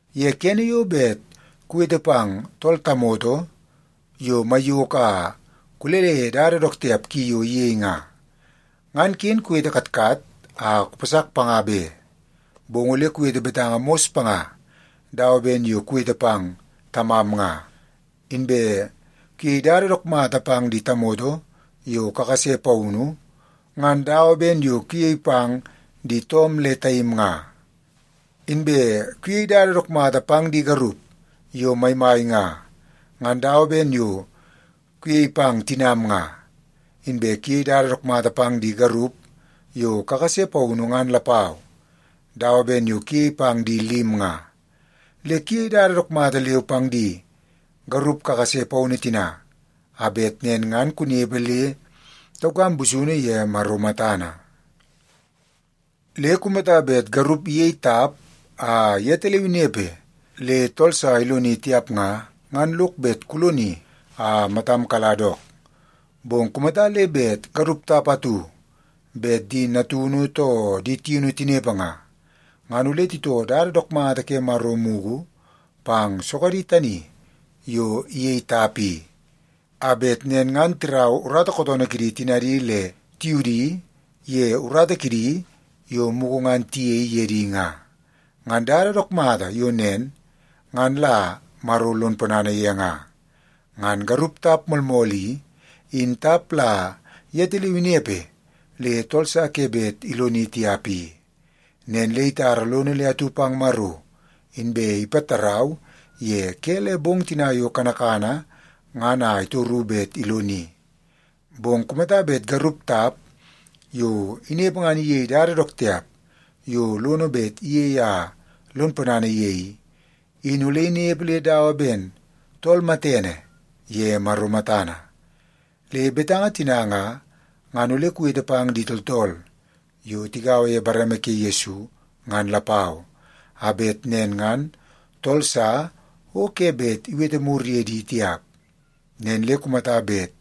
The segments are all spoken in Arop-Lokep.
Ye kene yo bet kuwete pang tool tamoto yo maiyoko a kulele ye dada dook tiap ki yo iyei nga, ngan ken kuwete katkat a kupasak panga be. Bong ole kuwete betanga mos panga dawa ben yo kuwete pang tamam nga. Inbe kuyei dada dook mata pang di tamoto yo kakase paunu, ngan dawa ben yo kuyei pang di toom le taim nga. Inbe kuyei dada dook mata pang di garup yo maimai nga, ngan dawa ben yo kuyei pang tinam nga. Inbe kuyei dada dook mata pang di garup yo kakase paunu ngan lapau, dawa ben yo kuyei pang di lim nga. Le kuyei dada dook mata leu pang di garup kakase paunu tina, a bet nen ngan kunepe le taukam busunu ye Maro matana. Le kumata bet garup iyei tap a yetaleu inepe le tool sa iloni tiap nga, ngan lok bet kuloni a matam kala dook. Bong kumata le bet garup tap atu bet di natunu too di tiunu tinepe nga, ngan ole titoo dada dook mata ke Maro mugu pang sogadi tani yo iyei tap i. A bet nen ngan tirau urata kootoonoo kidi tinadi le tiudi ye urata kidi yo mugu ngan tiyei ye di nga. Ngan dada dook mata yo nen, ngan la Maro lon ponana ye nga. Ngan garup tap moolmool i, in tap la yetaleu inepe le tool sa ke bet iloni tiap i. Nen le itara lono le atu pang Maro, inbe ipatarau ye ke le bong tina yo kanakana ngan a itoru bet iloni. Bong kumata bet garup tap yo inepe ngan iyei dada dook tiap yo lono bet iyei a lon ponana ye i, in ole inepe le dawa ben tool matene ye Maro matana. Le betanga tina nga, ngan ole kuwete pang di tooltool yo tigaua ye bareme ke Yesu ngan lapau, a bet nen ngan tool sa o ke bet iwete mur ye di tiap. Nen le kumata bet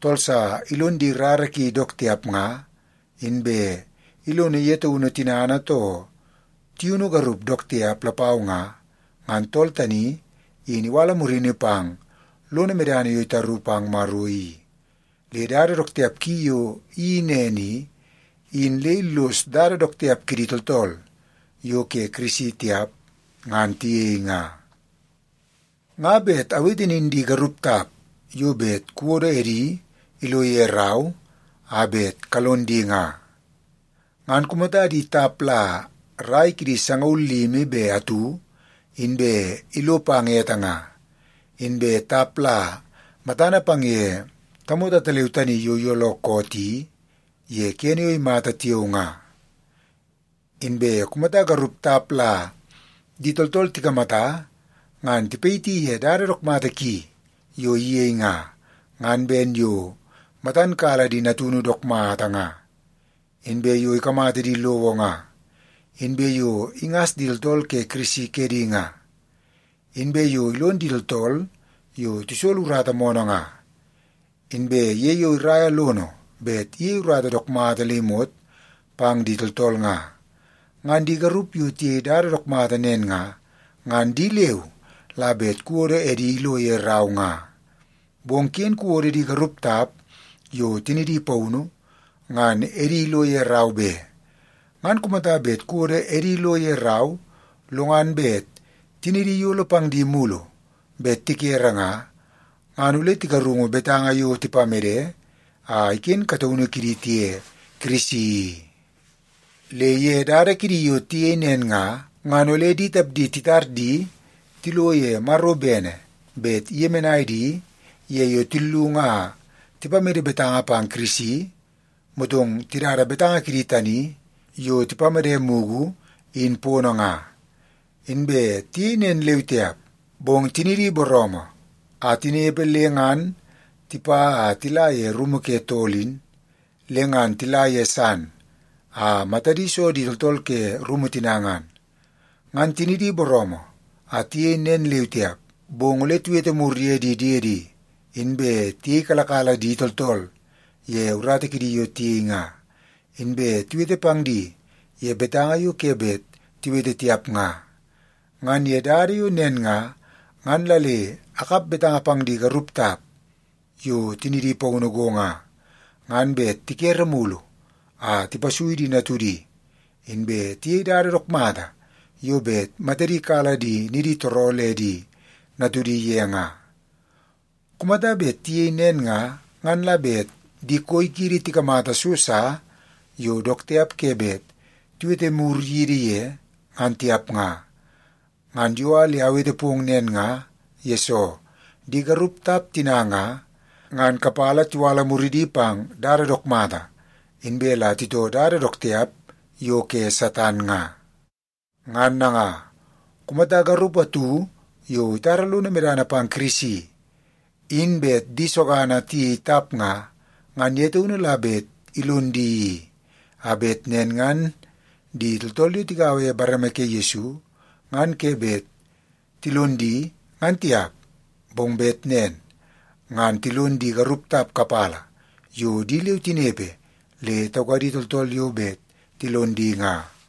tool sa ilon di rara ki dook tiap nga, inbe ilono ye taunu tinana too tiunu garup dook tiap lapau nga, ngan tool tani in iwala murini pang lono medana yo itaru pang Maro i. Le dada dook tiap ki yo iyeii nen i, in le illos dada dook tiap kidi tooltool yo ke Kirisi tiap ngan tiyei nga. Nga bet awete nin di garup tap yo bet kuwodo edi ilo ye rau a bet kalon di nga, ngan kumata di tap la rai kidi sangaul limi be atu inbe ilo pang ete nga. Inbe tap la matana pang ye tamoto ataleu tani yo iyooloo koot i ye kene yo imata tiao nga. Inbe kumata garup tap la di tooltool tikamata ngan tipayiti ye dada dook mata ki yo iyei nga, ngan ben yo matan kala di natunu dook mata nga, inbe yo ikamata di lowo nga, inbe yo ingas di tooltool ke Kirisi kedi nga, inbe yo ilon di tooltool yo tisolo urata moonoo nga, inbe ye yo iraia lono bet iyei urata dook mata le imot pang di tooltool nga. Ngan di garup yo tiyei dada dook mata nen nga, ngan di leu la bet kuwodo edi ilo ye rau nga. Bong ken kuwodo di garup tap yo tinidi paunu, ngan edi ilo ye rau be. Ngan kumata bet kuwodo edi lo ye rau, lo ngan bet tinidi iyolo pang di mulu bet tikere nga, ngan ole tigarungu betanga yo tipamede a iken kataunu kidi tiye Kirisi i. Le ye dada kidi yo tiyei nen nga, ngan ole di tapdi titar di tilo ye Maro bene bet iyemenai di ye yo tillung a tipamede betanga pang Kirisi, motong tidada betanga kidi tani yo tipamede mugu, in pono nga. Inbe tiyei nen leu tiap, bong tinidi booroomoo a tinepe le ngan tipa a tila ye rumu ke tool in, le ngan tila ye san a matadi so di tooltool ke rumu tina ngan. Ngan tinidi booroomoo a tiyei nen leu tiap, bong ole tiwete mur ye di diedi, inbe tiyeikalakala di tooltool ye urata kidi yo tiyei nga, inbe tiwete pang di ye betanga yo ke bet tiwete tiap nga. Ngan ye dada yo nen nga, ngan la le akap betanga pang di garup tap yo tinidi paunu go nga, ngan bet tikere mulu a tipasui di natudi, inbe tiyei dada dook mata yo bet matadi kala di niditooroo le di natudi ye nga. Kumata bet tiyei nen nga, ngan la bet di koi kiidi tikamata so sa yo dook tiap ke bet tiwete mur yidi ye, ngan tiap nga. Ngan yo a le awete pong nen nga, yesoo di garup tap tina nga, ngan kapala tiwala muridi pang dada dook mata, inbe la titoo dada dook tiap yo ke Satan nga. Ngan nanga, kumata garup atu yo itara lono medana pang Kirisi, in bet di sogana tiyei tap nga, ngan ye taunu la bet ilon di i, a bet nen ngan di tooltool yo tigaua ye bareme ke Yesu ngan ke bet tilon di, ngan tiap. Bong bet nen ngan tilon di garup tap kapala yo di leu tinepe le taukadi tooltool yo bet tilon di nga.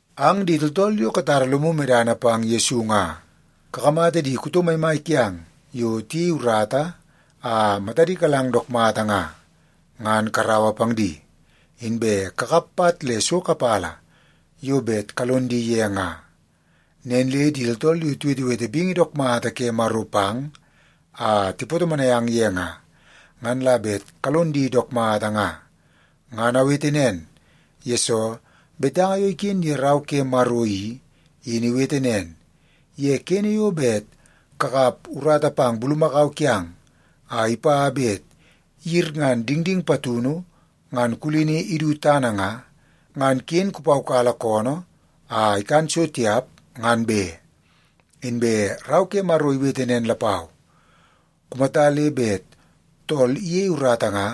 Ang di tooltool yo katara lomu medana pang Yesu nga, kakamata di kuto maimai kiang yo tiyei urata a matadi kalang dook mata nga, ngan karaua pang di, inbe kakap pat le so kapala yo bet kalon di ye nga. Nen le di tooltool yo tiwetewete bingi dook mata ke Maro pang a tipatomonai ang ye nga, ngan la bet kalon di dook mata nga. Ngan awete nen, yesoo betanga yo iken ye Rau ke Maro i, in iwete nen, “Ye kene yo bet kakap urata pang bulumakau kiang a ipa bet iyirngan dingding patunu ngan kulini idu tana nga, ngan ken kupaukala koonoo a ikan so tiap ngan be.” Inbe Rau ke Maro iwete nen lapau, “Kumata le bet tool iyei urata nga,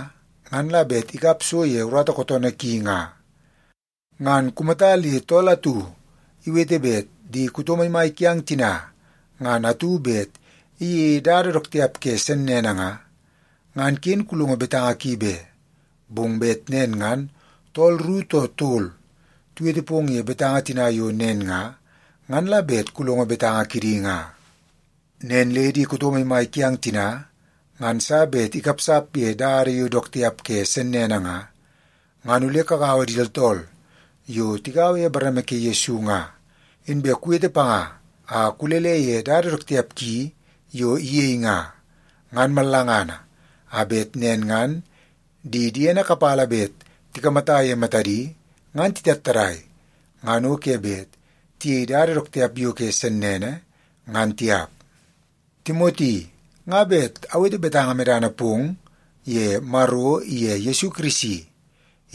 ngan la bet ikap so ye urata kootoonoo ki nga.” Ngan kumata le tool atu iwete bet di kuto maimai kiang tina ngan atu bet iyeie dada dook tiap ke sennene nga, ngan ken kulongo betanga ki be. Bong bet nen ngan tool ru too tol tiwete pong ye betanga tina yo nen nga, ngan la bet kulongo betanga kidi nga. Nen le di kuto maimai kiang tina ngan sa bet ikapsap ye dada yo dook tiap ke sennene nga, ngan ole kugaua di tooltool yo tigaua ye bareme ke Yesu nga, inbe kuwete panga a kulele ye dada dook tiap ki yo iyei nga, ngan mallangana, a bet nen ngan di diene kapala bet tikamata ye matadi, ngan titattadai, ngan o ke bet tiyei dada dook tiap yo ke sennene, ngan tiap. Timoti, nga bet awete betanga medana pong ye Maro iye Yesu Kirisi,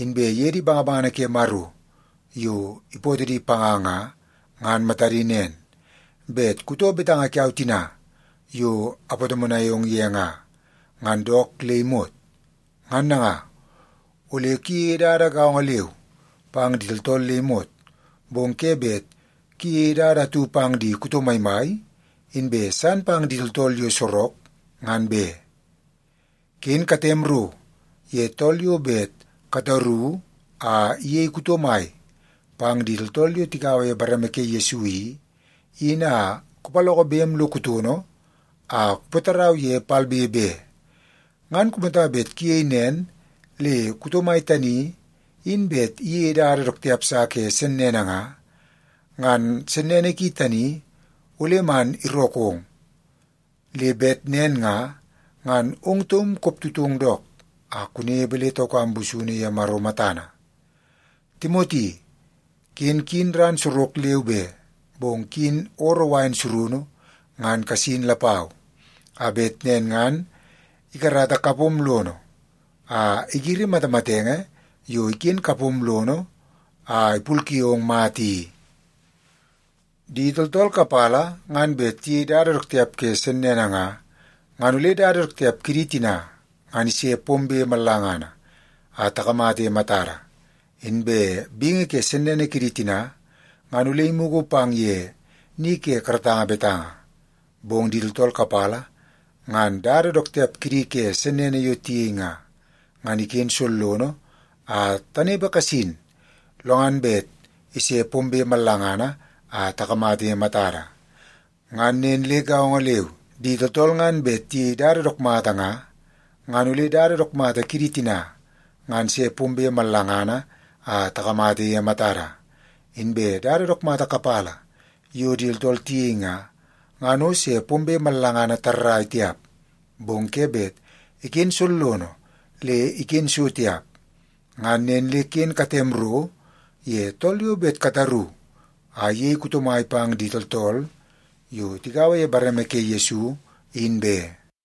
inbe ye di bangabangana ke Maro yo ipootoo di panga nga, ngan matadi nen, bet kutoo betanga kiau tina yo apatomonai ong ye nga, ngan dook le imot. Ngan nanga, ole kuyeie dada gaongo leu pang di tooltool le imot, bong ke bet kuyeie dada atu pang di kuto maimai, inbe san pang di tooltool yo sorok ngan be. Ken katem ro ye tool yo bet kataru a iyei kuto mai pang di tooltool yo tigaua ye bareme ke Yesu i, in a kupaloko bem lo kutono a kupatarau ye palbe be. Ngan kumata bet kuyei nen le kuto mai tani, in bet iyeie dada dook tiap sa ke sennene nga, ngan sennene ki tani ole man irookong. Le bet nen nga, ngan ong taum koptutong dook a kunepe le taukam busunu ye Maro matana. Timoti, ken kuyin ran sorok leu be, bong kuyin ooroo wain surunu ngan kasin lapau, a bet nen ngan ikarata kapom lono a igiri matamatenge yo iken kapom lono a ipulke ong mata i. Di tooltool kapala ngan bet tiyei dada dook tiap ke sennene nga, ngan ole dada dook tiap kidi tina, ngan ise pombe mallangana a takamata ye matada. Inbe bingi ke sennene kidi tina, ngan ole imugu pang ye ni ke karatanga betanga. Bong di tooltool kapala ngan dada dook tiap kidi ke sennene yo tiyei nga, ngan iken sollono a tanepe kasin lo ngan bet ise pombe mallangana a takamata ye matada. Ngan nen le gaongo leu, di tooltool ngan bet tiyei dada dook mata nga, ngan ole dada dook mata kidi tina, ngan se pombe mallangana a takamata ye matada. Inbe dada dook mata kapala yo di tooltool tiyei nga, ngan o se pombe mallangana tarrai tiap, bong ke bet iken sollono le iken so tiap. Ngan nen le ken katem ro ye tool yo bet kataru a iyei kuto mai pang di tooltool yo tigaua ye bareme ke Yesu in be.